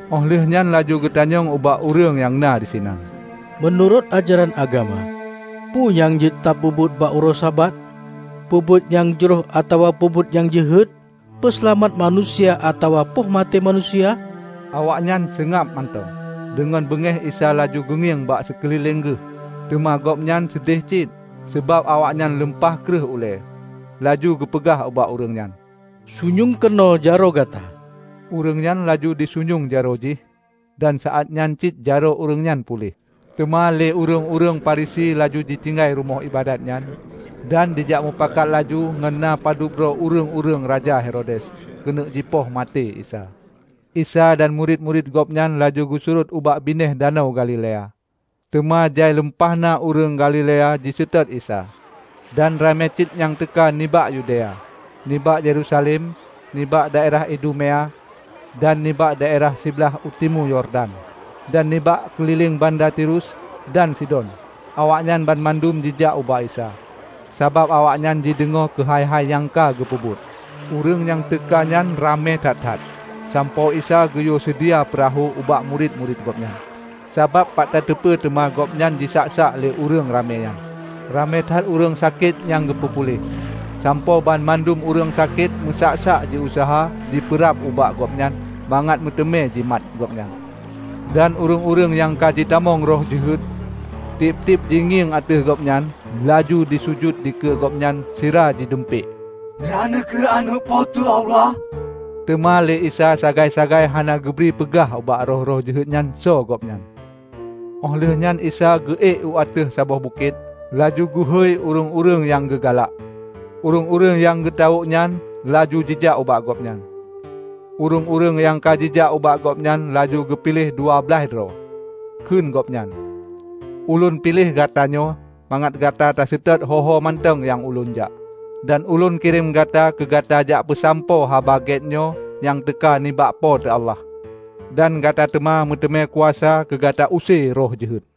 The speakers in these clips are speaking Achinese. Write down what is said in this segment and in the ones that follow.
Óh lheueh nyan laju geutanyong ubak ureuëng nyang na disinan, "Meunurot ajaran agama, peue nyang jeuet tapeubuet bak uroe Sabat? Peubuet nyang jroh atawa peubuet nyang jeuhet? Peuseulamat manusia atawa poh maté manusia?" Awaknyan seungab mantong. Deungon beungéh Isa laju geungieng ban sikeulileng Geuh, teuma Gobnyan seudeh cit, sabab awaknyan lumpah kréuh ulée. Laju geupeugah ubak ureuëng nyan, "Sunyueng keunoe jaroe gata." Ureuëng nyan laju jisunyueng jaroe jih, dan saát nyan cit jaroe ureuëng nyan puléh. Teuma lé ureuëng-ureuëng Farisi laju jitinggai rumoh iébadat nyan, dan jijak mupakat laju ngon na padub droe ureuëng-ureuëng raja Herodes, keuneuk jipeumaté Isa. Isa dan murit-murit gobnyan laju geusurot ubak binéh Danau Galilea. Teuma jai lumpah na ureuëng Galilea jiseutôt Isa, dan ramé cit nyang teuka nibak Yudea, nibak Yerusalem, nibak daerah Idumea, dan nibak daerah siblaih u timu Yordan, dan nibak keulileng banda Tirus dan Sidon. Awaknyan banmandum jijak ubak Isa, sabab awaknyan jideungoe keuhai-hai nyang ka geupeubuet. Ureuëng nyang teuka nyan ramé that-that, sampoe Isa geuyue seudia peurahô ubak murit-murit Gobnyan, sabab pat tateupeue teuma Gobnyan jisak-sak lé ureuëng ramé nyan. Ramé that ureuëng sakét nyang geupeu puléh, sampoe banmandum ureuëng sakét meusak-sak jiuseuha jipeurab ubak Gobnyan mangat meuteumé jimat Gobnyan. Dan ureuëng-ureuëng nyang ka jitamong roh jeuhet, tieb-tieb jingieng ateueh Gobnyan, laju jisujut dikeue Gobnyan sira jidumpék, "Droeneueh kheueh Aneuëk Po teu Allah!" Teuma lé Isa sagai-sagai hana geubri peugah ubak roh-roh jeuhet nyan soe Gobnyan. Óh lheueh nyan Isa geu ék u ateueh saboh bukét, laju geuhôi ureuëng-ureuëng nyang geugalak. Ureuëng-ureuëng nyang geutawök nyan laju jijak ubak Gobnyan, ureuëng-ureuëng nyang ka jijak ubak Gobnyan laju geupiléh dua blaih droe. Kheun Gobnyan, "Ulôn piléh gatanyoe, mangat gata taseutôt ho-ho mantong nyang ulôn jak, dan ulôn kirém gata keu gata jak peusampoe Haba Gét nyoe nyang teuka nibak Po teu Allah, dan gata teuma meuteumé kuasa keu gata use roh jeuhet."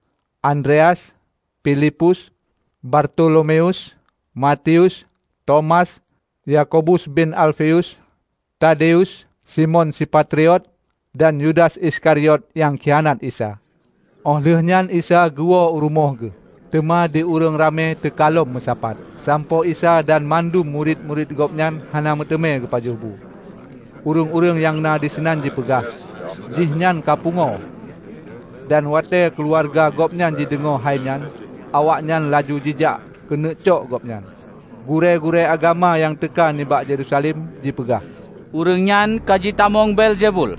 Andreas, Filipus, Bartolomeus, Matius, Tomas, Yakobus bin Alfeus, Tadeus, Simon si Patriot, dan Yudas Iskariot nyang khianat Isa. Óh lheueh nyan Isa geuwoe u rumoh Geuh. Teuma di ureuëng ramé teuka lom meusapat, sampoe Isa dan mandum murit-murit Gobnyan hana meuteumé geupajoh bu. Ureuëng-ureuëng nyang na disinan jipeugah, "Jih nyan kapungoe!" Dan watée keuluwarga Gobnyan geudeungoe hai nyan, awaknyan laju jijak keuneuk cok Gobnyan. Gurée-gurée agama nyang teuka nibak Yerusalem jipeugah, "Ureuëng nyan ka jitamong Beelzebul!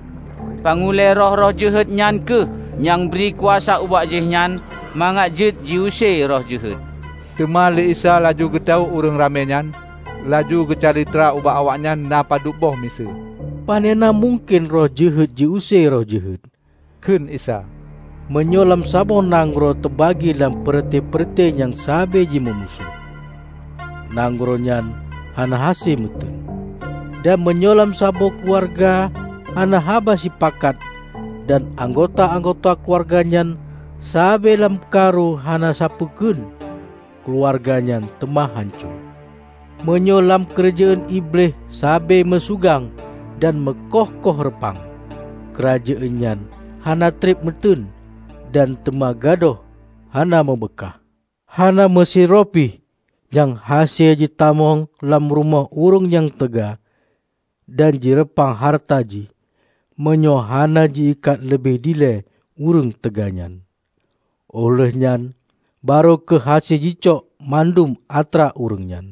Pang ulée roh-roh jeuhet nyan kheueh nyang bri kuasa ubak jihnyan mangat jeuet jiuse roh jeuhet." Teuma lé Isa laju geutawök ureuëng ramé nyan, laju geucalitra ubak awaknyan na padubboh miseue. "Panena mungken roh jeuhet ji-use roh jeuhet," kheun Isa. "Meunyoe lam saboh nanggroe teubagi lam peureute-peureute nyang sabe jimeumusoh, nanggroe nyan hana hase meuteun. Dan meunyoe lam saboh keuluwarga hana haba sipakat dan anggota-anggota keuluwarga nyan sabe lam karu hana sapeue kheun, keuluwarga nyan teuma hanco. Meunyoe lam keurajeuen Iblih sabe meusugang dan meukoh-koh reupang, keurajeuen nyan hana treb meuteun dan teuma gadôh hana meubeukaih. Hana meusidroe pih nyang hase jitamong lam rumoh ureuëng nyang teuga dan jireupah hareuta jih meunyoe hana ji-ikat leubeh ilée ureuëng teuga nyan. Óh lheueh nyan, barô kheueh hase jicok mandum atra ureuëng nyan.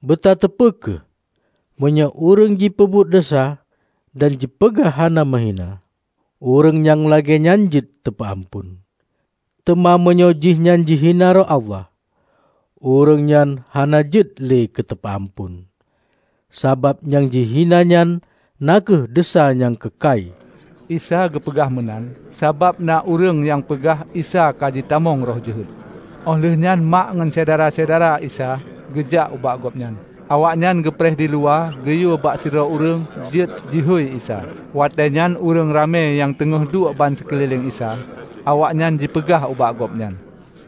Beutateupeue kheueh! Meunyoe ureuëng jipeubuet desya dan jipeugah haba meuhina, ureuëng nyang lagée nyan jeuet teupeu amphon. Teuma meunyoe jihnyan jihina roh Allah, ureuëng nyan hana jeuet le teupeu amphon! Sabab nyang jihina nyan na kheueh desya nyang keukai." ( Isa geupeugah meunan sabab na ureuëng nyang peugah Isa kajitamong roh jeuhet.) Óh lheueh nyan Mak ngon syedara-syedara Isa geujak ubak Gobnyan. Awaknyan geupreh diluwa geuyue bak sidroe ureuëng jeuet jihôi Isa. Watée nyan ureuëng ramé nyang teungoh duek bansikeulileng Isa. Awaknyan jipeugah ubak Gobnyan,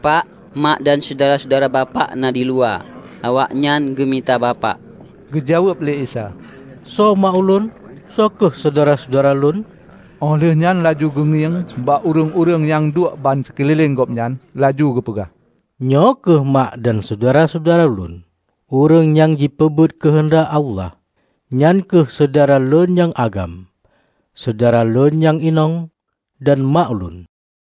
"Pak, mak dan syedara-syedara bapak na diluwa. Awaknyan geumita Bapak." Geujaweueb lé Isa, "Soe mak Ulôn? Soe kheueh syedara-syedara Lôn?" Óh lheueh nyan laju geungieng bak ureuëng-ureuëng nyang duek bansikeulileng Gobnyan laju geupeugah, "Nyoe kheueh mak dan syedara-syedara Lôn! Ureuëng nyang jipeubuet keuheundak Allah, nyan kheueh syedara Lôn nyang agam, syedara Lôn nyang inong, dan mak Ulôn."